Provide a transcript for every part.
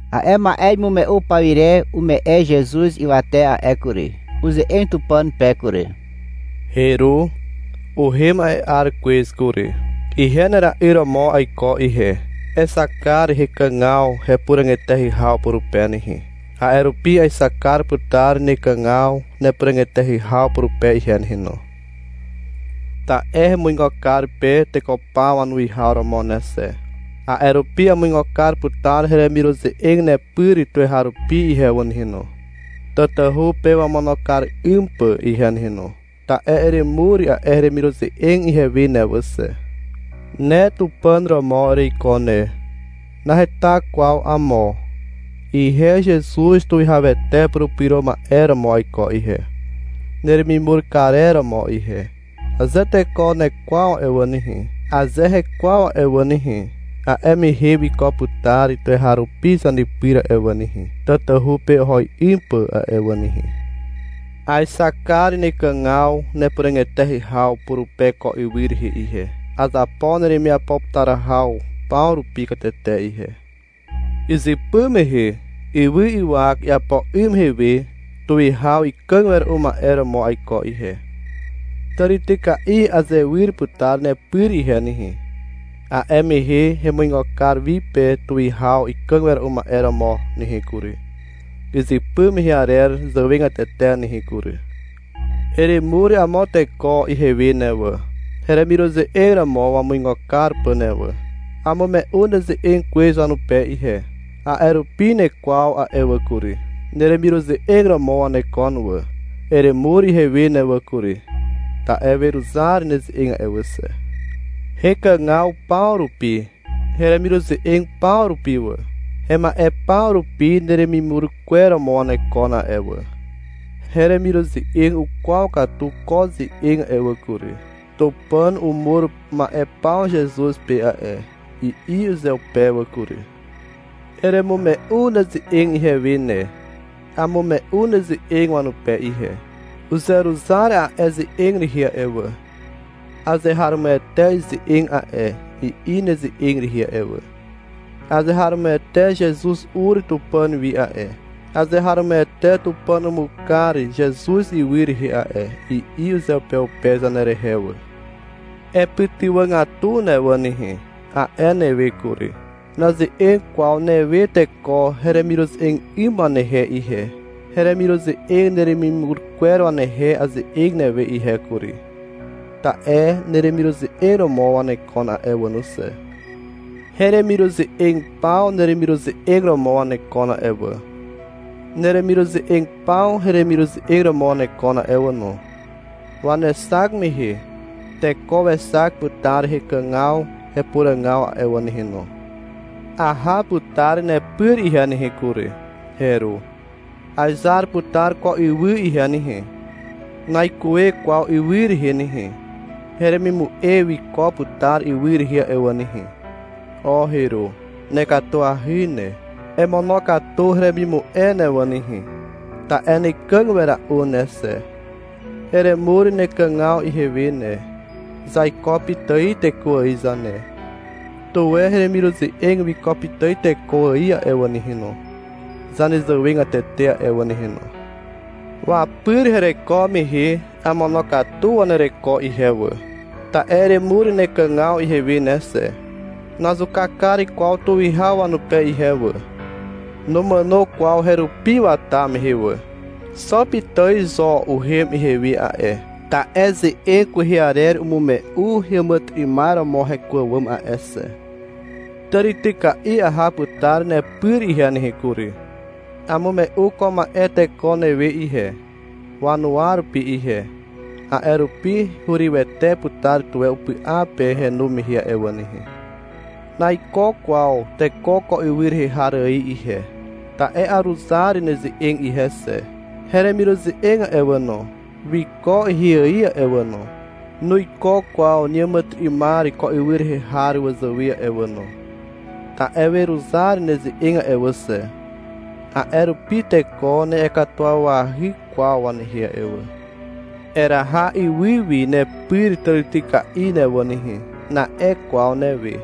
A'e ma'e imume'u pawire ume'e Zezuz ywate a'e kury. Uze'eg Tupàn pe kury. — Heru, uhem a'e 'ar kwez kury. Ihe nera'yr romo aiko ihe. Exak kar hekàgaw hepuràg eteahy haw purupe nehe. A'e rupi aexak kar putar nekàgaw nepuràg eteahy haw purupe ihe nehe no. Ta'e hemuigo kar pe teko paw wanuwihaw romo ne xe. A'e rupi amuigo kar putar heremiruze'eg nepyr tuweharupi ihe wà nehe no, tatahu pe wamono kar 'ym pà ihe wà nehe no, ta'e eremur a'e heremiruze'eg ihewe ne wà xe. Ne Tupàn romo ereiko ne. Naheta kwaw amo. Ihe Zezuz Tuwihawete Purupyro Ma'e romo aiko ihe, neremimur karer romo ihe. Aze teko nekwaw a'e wà nehe, aze hekwaw a'e wà nehe, a'e mehe wiko putar tuweharupi zanepyr a'e wà nehe, tatahu pe oho 'ym pà a'e wà nehe. Aexak kar nekàgaw nepuràg eteahy haw purupe ko ywy rehe ihe. Azapo neremiapo putar haw paw rupi katete ihe. Izypy mehe ywy ywak iapo 'ym mehe we tuwihaw ikàg wera'u ma'e romo aiko ihe. Tàrityka'i azewyr putar nepyr ihe nehe. A'e mehe hemuigo kar wi pe tuwihaw ikàg wera'u ma'e romo nehe kury, izypy mehe arer zàwegatete nehe kury. Eremur amo teko ihewe ne wà, heremiruze'eg romo wamuigo kar pà ne wà. Amume'u neze'eg kwez wanupe ihe. A'e rupi nekwaw a'e wà kury. Neremiruze'eg romo wanekon wà. Eremur ihewe ne wà kury. Ta'e weruzar neze'eg a'e wà xe. Hekàgaw paw rupi, heremiruze'eg paw rupi wà, hema'e paw rupi neremimur kwer romo wanekon a'e wà. Heremiruze'eg ukwaw katu ko ze'eg a'e wà kury. — Tupàn umur ma'e paw Zezuz pe a'e, i'i uzeupe wà kury. Eremume'u neze'eg ihewe ne. Amume'u neze'eg wanupe ihe. Uzeruzar a'e ze'eg rehe a'e wà. — Azeharomoete ize'eg a'e, i'i neze'eg rehe a'e wà. — Azeharomoete Zezuz ur Tupàn wi a'e, azeharomoete Tupàn umur kar Zezuz ywy rehe a'e, i'i uzeupeupe zanerehe wà. — Epytywàgatu ne wà nehe, a'e newe kury. Naze'eg kwaw newe teko heremiruze'eg 'ym wanehe ihe. Heremiruze'eg neremimur kwer wanehe aze'eg newe ihe kury, ta'e neremiruze'eg romo wanekon a'e wà no xe. Heremiruze'eg paw neremiruze'eg romo wanekon a'e wà. Neremiruze'eg paw heremiruze'eg romo wanekon a'e wà no. Wanexak mehe teko wexak putar hekàgaw hepuràgaw a'e wà nehe no. Aha putar nepyr ihe nehe kury, Heru. Aezar putar ko ywy ihe nehe. Naikuwe kwaw ywy rehe nehe. Heremimu'e wiko putar ywy rehe a'e wà nehe. O Heru, nekatuahy ne. Emonokatu heremimu'e ne wà nehe, ta'e nekàg wera'u ne xe. Eremur nekàgaw ihewe ne. Zaiko pitài teko ài zane. Tuwe heremiruze'eg wiko pitài teko ài a'e wà nehe no, zanezàwegatete a'e wà nehe no. Wapyr hereko mehe amonokatu wanereko ihe wà, ta'e eremur nekàgaw ihewe ne xe. Nazuka kar kwaw tuwihaw wanupe ihe wà. Numàno kwaw herupi wata mehe wà. Xo pitài zo uhem ihewi a'e, ta'e ze'eg kwehe arer umume'u heàmàtyry'ymar romo heko àwàm a'e xe. Tàrityka'i aha putar nepyr ihe nehe kury. Amume'u ko ma'e teko newe ihe, wanuwa rupi ihe. A'e rupi hurywete putar tuwe upy'a pe henu mehe a'e wà nehe. Naiko kwaw teko ko ywy rehe har ài ihe, ta'e aruzar neze'eg ihe xe. Heremiruze'eg a'e wà no, wiko ihe ài a'e wà no, nuiko kwaw neàmàtyry'ymar ko ywy rehe har wazàwe a'e wà no. Ta'e weruzar neze'eg a'e wà xe. A'e rupi teko na'iakatuwawahy kwaw wanehe a'e wà. — Eraha ywy wi nepyr tàrityka'i ne wà nehe, na'e kwaw newe,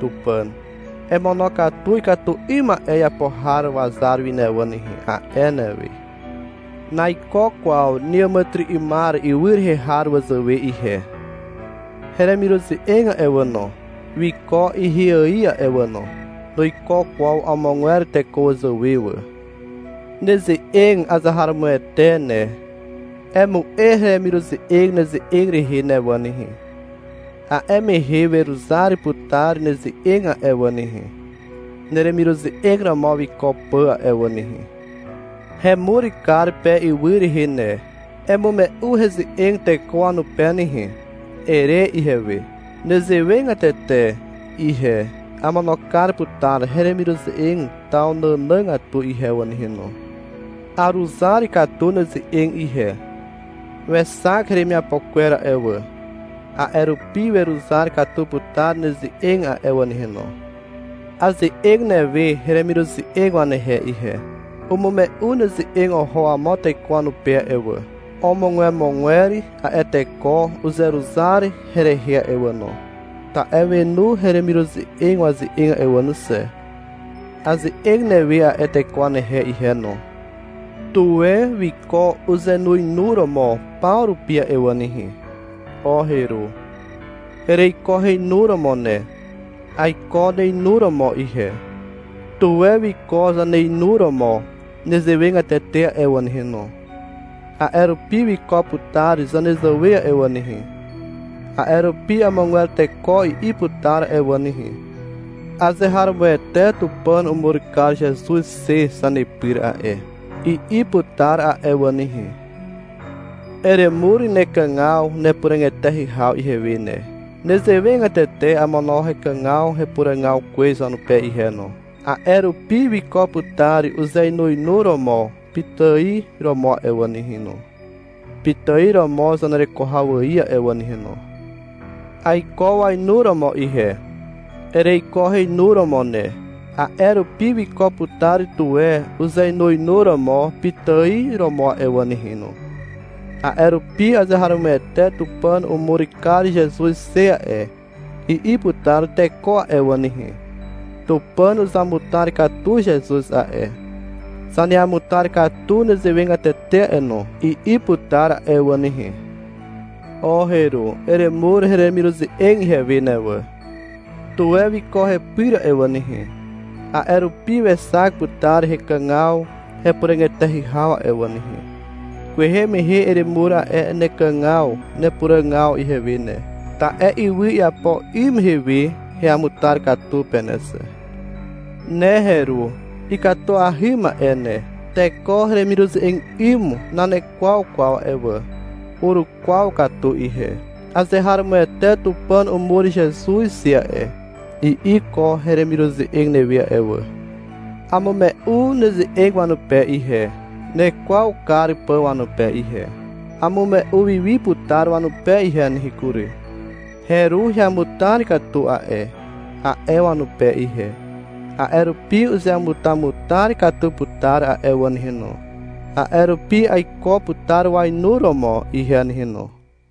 Tupàn. — Emonokatu ikatu 'ym ma'e iapo har wazar wi ne wà nehe, a'e newe. Naiko kwaw neàmàtyry'ymar ywy rehe har wazàwe ihe. Heremiruze'eg a'e wà no, wiko ihe ài a'e wà no. Nuiko kwaw amogwer teko wazàwe wà. Neze'eg azeharomoete ne. Emu'e heremiruze'eg neze'eg rehe ne wà nehe. A'e mehe weruzar putar neze'eg a'e wà nehe, neremiruze'eg romo wiko pà a'e wà nehe. Hemur kar pe ywy rehe ne. — Emume'u heze'eg teko wanupe nehe, ere ihewe. Nezewegatete ihe amono kar putar heremiruze'eg taw nànàgatu ihe wà nehe no. Aruzar katu neze'eg ihe. Wexak heremiapo kwer a'e wà. A'e rupi weruzar katu putar neze'eg a'e wà nehe no. Aze'eg newe heremiruze'eg wanehe ihe. Umume'u neze'eg oho amo teko wanupe a'e wà. Omogwemogwer a'e teko uzeruzar herehe a'e wà no, ta'e wenu heremiruze'eg waze'eg a'e wà no xe. Aze'eg newe a'e teko wanehe ihe no. Tuwe wiko uzeinuinuromo paw rupi a'e wà nehe. O Heru. Ereiko heinuromo ne. Aiko neinuromo ihe. Tuwe wiko zaneinuromo nezewegatete a'e wà nehe no. A'e rupi wiko putar zanezàwe a'e wà nehe. A'e rupi amogwer teko i'i putar a'e wà nehe, — Azeharomoete Tupàn umur kar Zezuz xe zanepyr a'e, i'i putar a'e wà nehe. Eremur nekàgaw nepuràg eteahy haw ihewe ne. Nezewegatete amono hekàgaw hepuràgaw kwez wanupe ihe no. A'e rupi wiko putar uzeinuinuromo pitài romo a'e wà nehe no, pitài romo zanereko haw ài a'e wà nehe no. Aiko wainuromo ihe. Ereiko heinuromo ne. A'e rupi wiko putar tuwe uzeinuinuromo pitài romo a'e wà nehe no. A'e rupi — Azeharomoete Tupàn umur kar Zezuz xe a'e, i'i putar teko a'e wà nehe. — Tupàn uzamutar katu Zezuz a'e, zaneamutar katu nezewegatete a'e no, i'i putar a'e wà nehe. O Heru. Eremur heremiruze'eg ihewe ne wà. Tuwe wiko hepyr a'e wà nehe. A'e rupi wexak putar hekàgaw hepuràg eteahy haw a'e wà nehe. Kwehe mehe eremur a'e nekàgaw nepuràgaw ihewe ne, ta'e ywy iapo 'ym mehe we heamutar katu pe ne xe. Ne Heru ikatuahy ma'e ne. Teko heremiruze'eg 'ym nanekwaw kwaw a'e wà. Urukwaw katu ihe. — Azeharomoete Tupàn umur Zezuz xe a'e, i'i ko heremiruze'eg newe a'e wà. Amume'u neze'eg wanupe ihe, nekwaw kar pà wanupe ihe. Amume'u wi wi putar wanupe ihe nehe kury. — Heru heamutar katu a'e, a'e wanupe ihe. A'e rupi uzeamutamutar katu putar a'e wà nehe no. A'e rupi aiko putar wainuromo ihe nehe no.